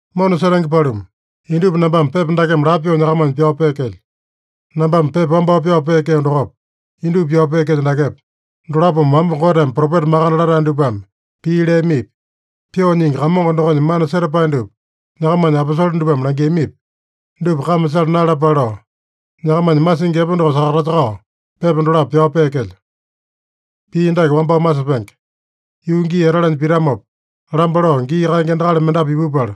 Mona setenge paluma, indupa nambame pepa dakeme lapo pyoo nyakamanya pyao peekelyo. Nambame pepa wambao pyao peekeo dokopa, indupa pyao peekelyo dakepa, dolapome wamba Goteme propeta makande latae dupame pii leamipi, Pyoo Nyingi Kamongo dokonya mana setapae dupa nyakamanya aposole dupame langiamipi, dupa kame sala naeyalapale lao, nyakamanya masingi epe doko sakatasakao, pepa dolapo pyao peekelyo. Pii dake wambao masepenge: Yuu gii etalanya pitamopa, lamba lao gii kaenge endakali mendapu ipupala,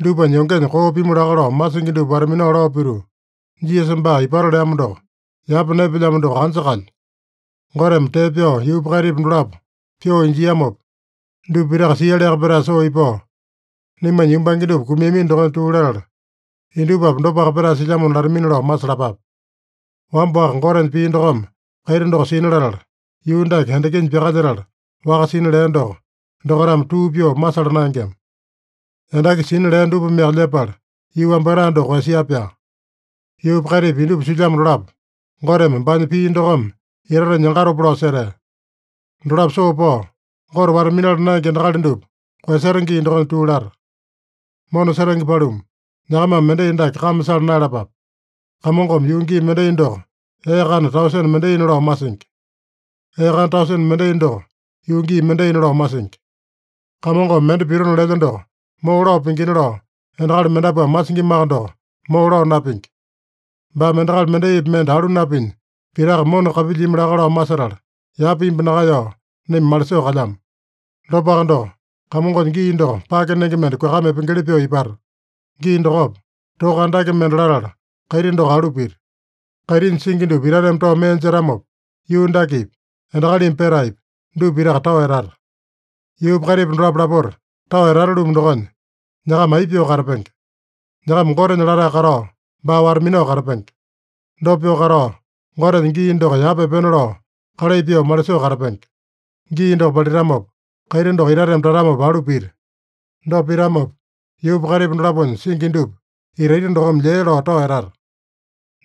dupanya yongenya koo pimu laka lao masingi dupa wata-minao lao pituu, “Jisasa baa ipato leamo doko, yapa naepelyamo doko anja kalya? Goteme tee pyao yuupa kaitipa dolapo pyoo injiamopa, dupa pitaka sialiaka petae soo ipao, naimanya yumbange dupa kumiamino dokonya tuu latala, indupapi dopaka petae silyamona” latamina lao masalapape. Wamba-waka Gotenya pii dokome kaiti doko sina latala, yuu dake endakinya pyakalyetala waka sina lea doko, dokaitame tuu pyoo masala naengema. Endaki sina lea dupameaka lyepala yuu wambatae doko koeyasia-pyaa. Yuupa kaitipa indupa silyamo dolapo Goteme baanya pii dokome itatenya yangatopa lao setea. Dolapo soo pao, Gote wata-minala naenge endakali dupa koeyaseta gii dokonya tuu lata. Mona setenge paluma, nyakamame mendai dake kame sala naeyalapape: Kamongome yuu gii mendai doko ee kana tausene mendaina lao masingi. Ee kana tausene mendai doko yuu gii mendaina lao masingi. Kamongome mende pitona lelya doko moo lao pingina lao endakali mendapuame masingimaka doko, moo lao napingi. Baame endakali mendaipi mende alu napinya, pitaka mona kapilyimi laka lao masetala, yapa imbu nakaeyao naima malisoo kalyamo. Dopaka doko, Kamongonya gii doko pake nenge mende kuakama epengeli pyoo ipata. Gii dokopa, toka andake mende latala kaiti doko alu pita. Kaitinya singi dupa itateme tao mee jetamopa, yuu dakepi, endakalimi petaepi, dupa pitaka tao etata. Yuupa kaitipa dolapo lapota tao etata-lumu dokonya, nyakama aipa pyoo katapenge? Nyakama Gotenya latae katao, baa wata-minao katapenge. Dopa pyoo katao, Gotenya gii doko yapa epena lao kalai pyoo malisoo katapenge. Gii doko palitamopa, kaiti doko itateme tatamopa alu pita. Dopa pitamopa, yuupa kaitipa dolaponya singi dupa itaita dokome lyee lao tao etata.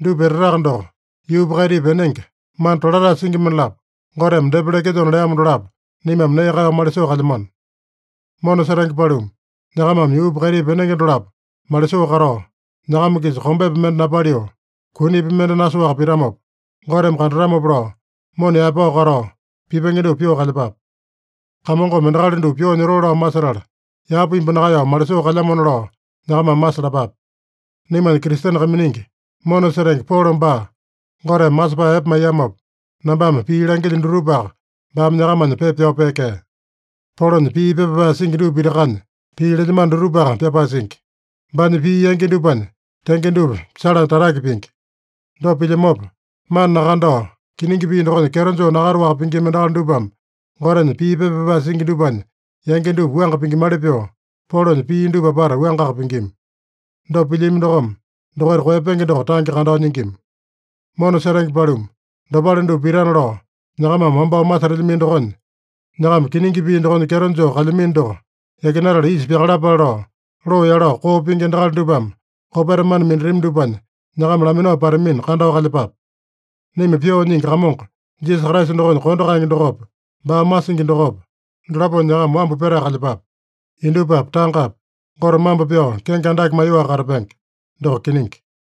Dupa etataka doko, yuupa kaitipa enenge, mana tolatae singi mendalapo Goteme depa lekelyona leamo dolapo naimame nee kaeyao malisoo kalyamano. Mona setenge paluma, nyakamame yuupa kaitipa enenge dolapo malisoo katao, nyakama-kisa kombepi mende napaliu, kunipi mende nasoaka pitamopa, Goteme kandatamopa lao, mona yaepao katao, pipenge dupa pyoo kalyepape. Kamongome endakali dupa pyoo nyotoo lao masetala, yapa imbu nakaeyao malisoo kalyamona lao nyakamame masalapape. Naimanya Kristene kaiminingi, mona setenge Polo baa Goteme masepae epe maiyamopa, nambame pii langilyo dutupaka baame nyakamanya pepa pyao peekea. Polonya pii pepa pyapae singi dupa pitakanya pii lelyamano dutupaka pyapae singi. Baanya pii yangi dupanya tenge dupa salanya tatake pingi. Dopa pilyamopa, mana nakandao, kiningi pii dokonya kyeto joo nakataowaka pingima endakali dupame, Gotenya pii pepa pyapae singi dupanya yangi dupa wuanga pingimali pyoo, Polonya pii dupa apata wuangaka pingima. Dopa pilyami dokome, dokaita koeyapenge doko tange kandao nyingima. Mona setenge paluma, dopale dupa pitana lao nyakamame wambao masetelyamino dokonya, nyakama kiningi pii dokonya kyeto joo kalyamino doko yakinatala isa pyakalapale lao, loo yalao koo pingi endakali dupame kopeta mana minatami dupanya nyakama laminao patamina, kandao kalyepape. Naima Pyoo Nyingi Kamongo Jisasa Kraisa dokonya kondo kaenge dokopa, baa masingi dokopa, dolaponya nyakama wambu petae kalyepape. Indupapi, tangapi Gote mambo pyao kenge andake maiyoaka katapenge. Doko kiningi.